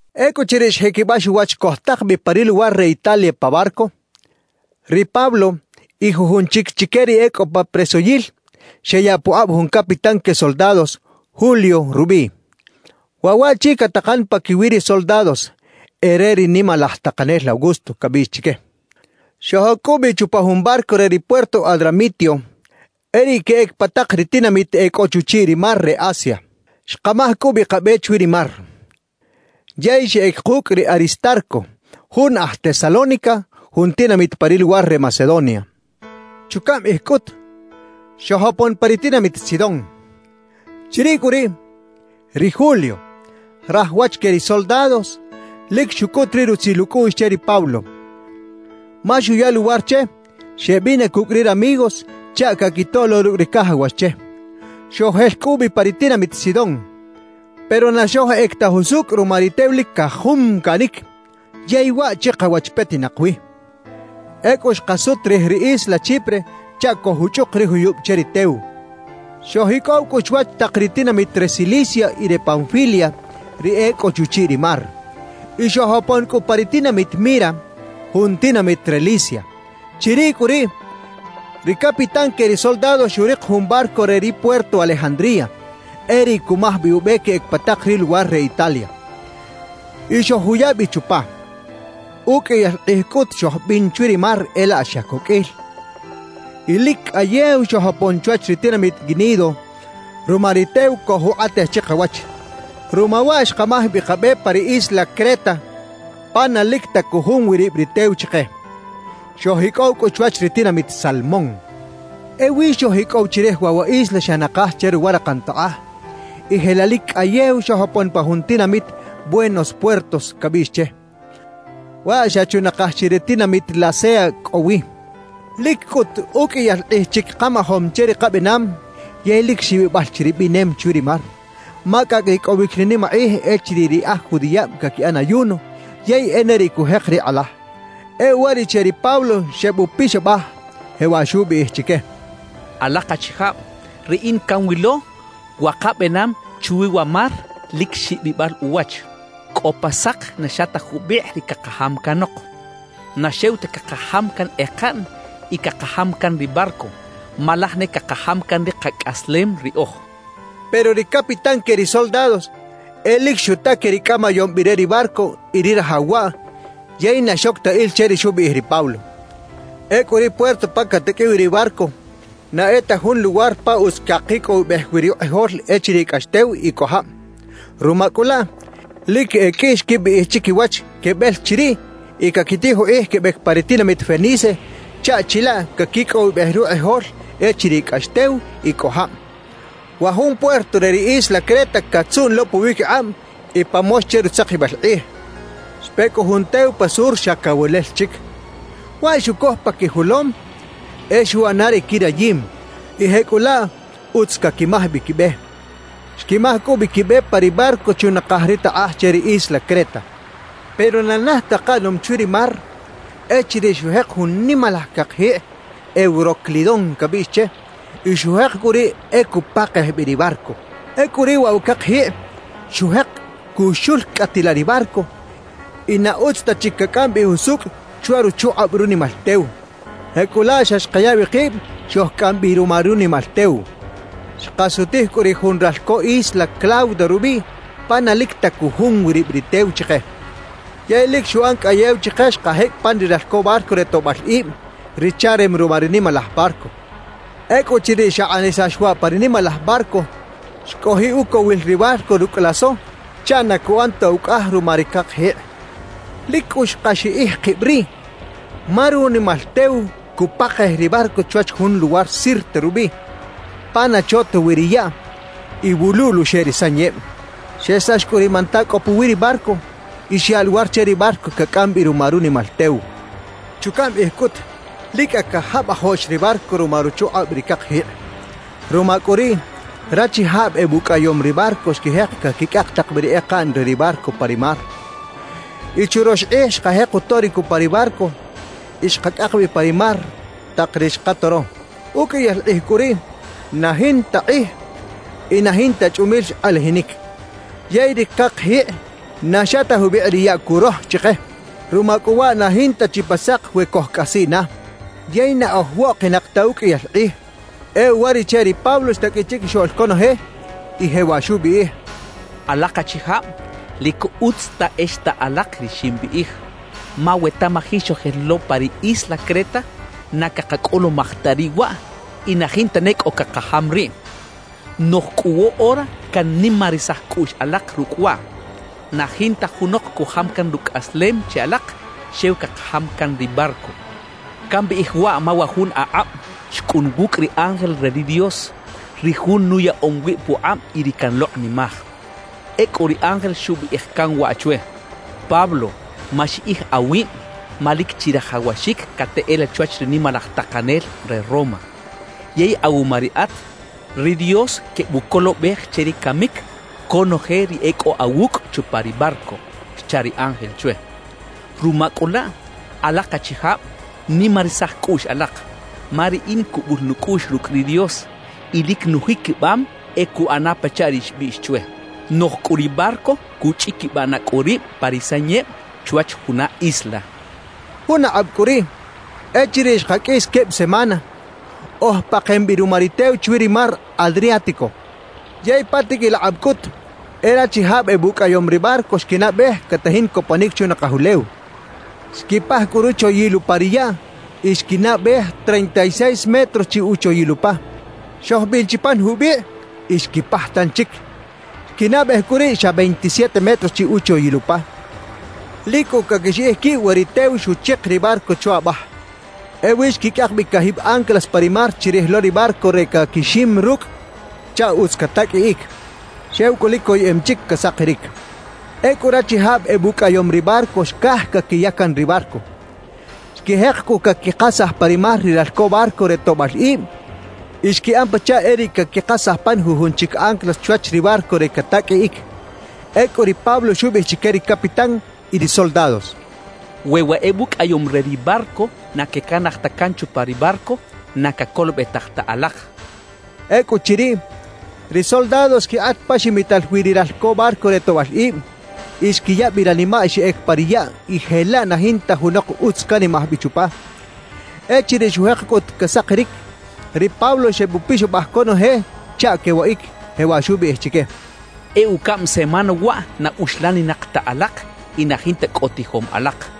Ecꞌuchiriꞌ xjiquibax uwach cojtak bi pa ri luwar re Italia pa barco, ri Pablo y jujun chic chique ri e cꞌo pa presoyil xeyaꞌ pukꞌab jun capitán que soldados, Julio rubiꞌ. Waꞌ waꞌchi catakan paquiwi ri soldados “E re ri nimalaj takanel Augusto” cabiꞌx chique. Xojoc cꞌu bi chupa jun barco re ri puerto Adramitio, e riꞌ queꞌec pa tak ri tinamit e cꞌo chuchiꞌ ri mar re Asia. Xkamaj cꞌu bi kabe chwi ri mar. Yey xeꞌec kucꞌ ri Aristarco, jun aj Tesalónica, jun tinamit pa ri luwar re Macedonia. Chucaꞌm kꞌij cꞌut, xojopon pa ri tinamit Sidón. Chiriꞌ cꞌu riꞌ, ri Julio, raj wach que ri soldados, lic xucꞌut ri rutzil ucꞌuꞌx che ri Pablo, ma xuya luwar che xeꞌbina cucꞌ ri ramigos chaꞌ caquitoꞌ lo rucꞌ ri cajawax che. Xojel cꞌu bi pa ri tinamit Sidón. Pero na xojꞌec ta jusucꞌ ruma ri tew lic cajumcaꞌnic, yey waꞌ chikawach petinak wi. Ecꞌu xkasut rij ri isla Chipre chaꞌ cojuchꞌuk ri juyub che ri tew. Xojicꞌow cꞌu chwach tak ri tinamit re Cilicia y re Panfilia, ri e cꞌo chuchiꞌ ri mar. Y xojopon cꞌu pa ri tinamit Mira, jun tinamit re Licia. Chiriꞌ cꞌu riꞌ, ri capitán que ri soldados xurik jun barco re ri puerto Alejandría, e riꞌ cumaj bi ube queꞌec pa tak ri luwar re Italia. Y xojuya bi chupa. Uqꞌuiyal kꞌij cꞌut xojbin chwi ri mar e laꞌ xa coqꞌuil, y lic cꞌayew xojopon chwach ri tinamit Gnido ruma ri tew cojukꞌatej chikawach. Ruma waꞌ xkamaj bi kabe pa ri isla Creta pa na lic ta cujum wi rib ri tew chike. Xojicꞌow cꞌu chwach ri tinamit Salmón. Ewi xojicꞌow chirij waꞌ wa isla xa nakaj che ruwa rakan takꞌaj y jelaꞌ lic cꞌayew xojopon pa jun tinamit Buenos Puertos, cabiꞌx che. Waꞌ xa chunakaj chi ri tinamit Lasea cꞌo wi. Lic cꞌut uqꞌuiyal kꞌij chic kajamom che ri kabenam yey lic xibibal chi ri binem chwi ri mar, ma cꞌacꞌ ricꞌowic ri nimakꞌij echiriꞌ ri aj judiꞌab caquiꞌan ayuno yey e ne riꞌ cujek ri kꞌalaj. E uwariꞌche ri Pablo xebupixabaj, jewaꞌ xubiꞌij chique: «Alak achijab, riꞌin canwilo wa kabenam chwi wa mar lic xibibal uwach. Cꞌo pa sak na xa ta jubikꞌ ri cakajam canok; na xew ta cakajam can ekaꞌn y cakajam can ri barco, ma laj ne cakajam can ri kacꞌaslem riꞌoj» xcha chique. Pero ri capitán que ri soldados e lic xuta que ri cꞌamayom bi re ri barco y ri rajaw waꞌ, yey na xoc ta il che ri xubiꞌij ri Pablo. Ecꞌu ri puerto pa cataqꞌuiꞌ wi ri barco na e ta jun luwar pa utz cakicꞌowibej wi rukꞌijol echiriꞌ cꞌax tew y cꞌo jab. Ruma cꞌu laꞌ, lic e qꞌui xquibiꞌij chiquiwach quebel chiriꞌ y caquitij ukꞌij quebec pa ri tinamit Fenice chaꞌ chilaꞌ caquicꞌowibej rukꞌijol echiriꞌ cꞌax tew y cꞌo jab. Wa jun puerto re ri isla Creta catzuꞌn lo puwiquikꞌab y pa mox che rutzakibal kꞌij. Xpe cꞌu jun tew pa sur xa cawelel chic. Waꞌ xucoj pa quijolom e xuꞌana ri quirayim, y jecꞌulaꞌ utz caquimaj bi quibe. Xquimaj cꞌu bi quibe pa ri barco chunakaj ri takꞌaj che ri isla Creta. Pero na naj ta kaꞌanom chwi ri mar echiriꞌ xujek jun nimalaj cakjikꞌ “Euroclidón” cabiꞌx che y xujek cꞌu riꞌ e cupakej bi ri barco. Ecꞌu riꞌ waꞌ wa cakjikꞌ xujek cuxulcꞌatilaꞌ ri barco y na utz ta chic cacꞌam bi jusucꞌ chwa ruchukꞌab runimal tew. Jecꞌulaꞌ xa xkaya bi kib xojcꞌam bi ruma runimal tew. Xkasutij cꞌu rij jun ralco isla Clauda rubiꞌ pa na lic ta cujum wi rib ri tew chike, yey lic xuꞌan cꞌayew chike xkajecꞌ pan ri ralco barco re toꞌbal ib, ri charem ruma ri nimalaj barco. Ecꞌuchiriꞌ xakꞌanisax waꞌ pa ri nimalaj barco, xcojiꞌ ucowil ri barco rucꞌ laso chaꞌ na cuꞌan ta ucꞌaj ruma ri cakjikꞌ. Lic cꞌu xkaxiꞌij kib riꞌ, ma runimal tew cupakej ri barco chwach jun luwar Sirte rubiꞌ, pa na cho ta wi ri yaꞌ y wuluꞌl uxeꞌ ri sanyeb. Xesax cꞌu ri manta cꞌo puwi ri barco y xyaꞌ luwar che ri barco cacꞌam bi ruma runimal tew. Chucaꞌm kꞌij cꞌut, lic cꞌa cajabajoꞌx ri barco ruma ruchukꞌab ri cakjikꞌ. Ruma cꞌu riꞌ rachijab ebucꞌayom ri barco xquijek caquicꞌak tak bi ri ekaꞌn re ri barco pa ri mar. Y churox kꞌij xkajek utoric upa ri barco y xkacꞌak bi pa ri mar tak ri xkatoro. Uqꞌuiyal kꞌij cꞌu riꞌ na jinta kꞌij y na jinta chꞌumil xkꞌalajinic, yey ri cakjikꞌ na xa ta jubikꞌ ri yaꞌ curoj chike. Ruma cꞌu waꞌ na jinta chi pa sak we cojcꞌasiꞌ na. Yey na oj woꞌkinak ta uqꞌuiyal kꞌij. E uwariꞌche ri Pablo xtaqꞌuiꞌ chiquixoꞌl conoje y jewaꞌ xubiꞌij: «Alak achijab, lic utz ta e xta alak ri ximbiꞌij; ma we tamaji xojel lo pa ri isla Creta, na cakacꞌulumaj ta riꞌ waꞌ y na jinta ne cꞌo cakajam riꞌ. »Noꞌj cꞌu woꞌora cannimarisaj cꞌuꞌx alak rucꞌ waꞌ: Na jinta junok cujam can rucꞌaslem che alak, xew cakajam can ri barco. Cambiꞌij waꞌ ma wa jun akꞌab xcꞌun wucꞌ ri ángel re ri Dios, ri Jun nuyaꞌom wib pukꞌab y ri canlokꞌnimaj. Ecꞌu ri ángel xubiꞌij can waꞌ chwe: “Pablo, maxiꞌij awib, ma lic chirajawaxic cateꞌela chwach ri nimalaj takanel re Roma. Yey awuma riꞌat, ri Dios quebucolobej che ri camic conoje ri e cꞌo awucꞌ chupa ri barco” xcha ri ángel chwe. Ruma cꞌu laꞌ, alak achijab, nimarisaj cꞌuꞌx alak. Ma riꞌin cubul nucꞌuꞌx rucꞌ ri Dios y lic nujiquibam e cuꞌanaꞌ pachaꞌ ri xbiꞌx chwe. Noꞌj cꞌu ri barco cuꞌchꞌiquibaꞌ na cꞌu rib pa ri sanyeb chwach juna isla» xcha ri Pablo. Jun akꞌab cꞌu riꞌ, echiriꞌ xkaqꞌuis queb semana, oj pakem bi ruma ri tew chwi ri mar Adriático. Yey pa tiqꞌuil akꞌab cꞌut, e rachijab ebucꞌayom ri barco xquinaꞌbej catajin coponic chunakaj ulew. Xquipaj cꞌu ruchoyil upa ri yaꞌ y xquinaꞌbej treinta y seis metros chi uchoyil upa. Xojbin chi pan jubikꞌ y xquipaj tanchic. Xquinaꞌbej cꞌu riꞌ xa veintisiete metros chi uchoyil upa. Lic cꞌu caquixiꞌij quib we ri tew xuchik ri barco chwa abaj. Ewi xquicꞌak bi cajib anclas pa ri mar chirij lo ri barco re caquixim rucꞌ chaꞌ utz cataqꞌuiꞌic. Xew cꞌu lic coyeꞌem chic casakiric. Ecꞌu rachijab ebucꞌayom ri barco xcaj caquiya can ri barco. Xquijek cꞌu caquikasaj pa ri mar ri ralco barco re toꞌbal ib y xquiꞌan pachaꞌ e riꞌ caquikasaj pan jujun chic anclas chwach ri barco re cataqꞌuiꞌic. Ecꞌu ri Pablo xubiꞌij chique ri capitán y ri soldados: «We wa ebucꞌayom re ri barco na quecanaj ta can chupa ri barco, na cacolobetaj ta alak» xchaꞌ. Ecꞌuchiriꞌ, ri soldados xquikꞌat pa ximital wi ri ralco barco re toꞌbal ib; y xquiya bi ranimaꞌ xeꞌec pa ri yaꞌ y jelaꞌ na jinta junok utz canimaj bi chupa. Echiriꞌ xujek cꞌut casakiric, ri Pablo xebupixabaj conoje chaꞌ quewaꞌic, jewaꞌ xubiꞌij chique: «E ucaꞌm semana waꞌ na uxlaninak ta alak y na jinta cꞌo tijom alak.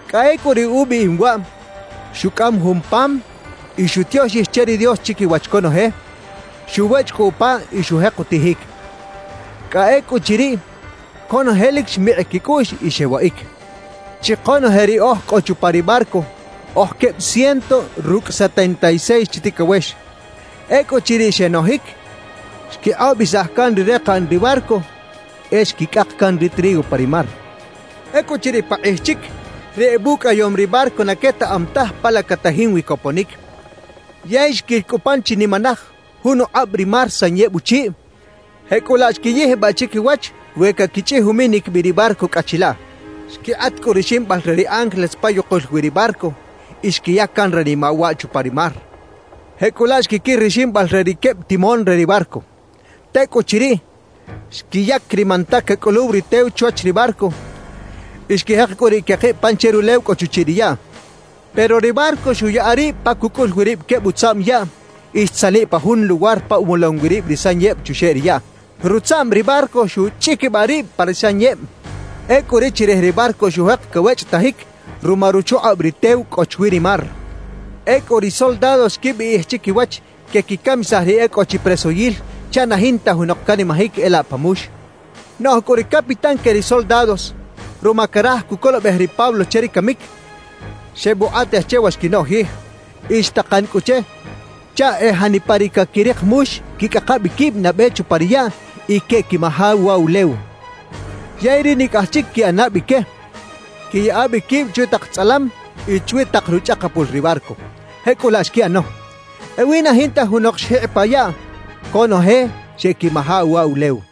Cꞌa ecꞌu riꞌ ubiꞌim waꞌ, xucꞌam jun pam y xutioxij che ri Dios chiquiwach conoje; xuwechꞌ cꞌu upa y xujek utijic. Cꞌa ecꞌuchiriꞌ, conoje lic xmikꞌ quicꞌuꞌx y xewaꞌic. Chi konoje ri oj cꞌo chupa ri barco, oj queb ciento rucꞌ setenta y seis chi ticawex. Ecꞌuchiriꞌ xenojic, xquikꞌobisaj can ri rekaꞌn ri barco, e xquicꞌak can ri trigo pa ri mar. Ecꞌuchiriꞌ pakꞌij chic, ri ebucꞌayom ri barco na quetaꞌam taj pa la catajin wi coponic. Yey xquil cꞌu pan chinimanaj jun ukꞌab ri mar sanyeb uchiꞌ; jecꞌulaꞌ xquiyijbaꞌ chiquiwach we caquichꞌij uminic bi ri barco cꞌa chilaꞌ. Xquikꞌat cꞌu ri ximbal re ri anclas pa yukul wi ri barco y xquiya can ranimaꞌ waꞌ chupa ri mar. Jecꞌulaꞌ xquiquir ri ximbal re ri queb timón re ri barco. Tecꞌuchiriꞌ, xquiyac ri manta cacꞌuluw ri tew chwach ri barco y xquijek cꞌu riꞌ quekib pan che rulew cꞌo chuchiꞌ ri yaꞌ. Pero ri barco xuꞌyaꞌa rib pa cucꞌul wi rib queb utzaꞌm yaꞌ y xtzaniꞌ pa jun luwar pa umolom wi rib ri sanyeb chuxeꞌ ri yaꞌ. Rutzaꞌm ri barco xuꞌchꞌiquibaꞌ rib pa ri sanyeb. Ecꞌu ri chirij ri barco xujek cawechꞌetajic ruma ruchukꞌab ri tew cꞌo chwi ri mar. Ecꞌu ri soldados xquibiꞌij chiquiwach quequicamisaj ri e cꞌo chi presoyil chaꞌ na jinta junok canimajic e laꞌ pa mux. Noꞌj cꞌu ri capitán que ri soldados, ruma caraj cucolobej ri Pablo che ri camic, xebukꞌatej che wa xquinoꞌjij. Y xtakan cꞌu che chaꞌ e janipa ri caquirik mux quicꞌaka bi quib nabe chupa ri yaꞌ y queꞌquimaja uwa ulew; yey ri nicꞌaj chic quiꞌana bi que, quiyaꞌa bi quib chwi tak tzꞌalam y chwi tak ruchꞌakapul ri barco. Jecꞌulaꞌ xquiꞌano. Ewi na jinta junok xjikꞌ pa yaꞌ; conoje xeꞌquimaja uwa ulew.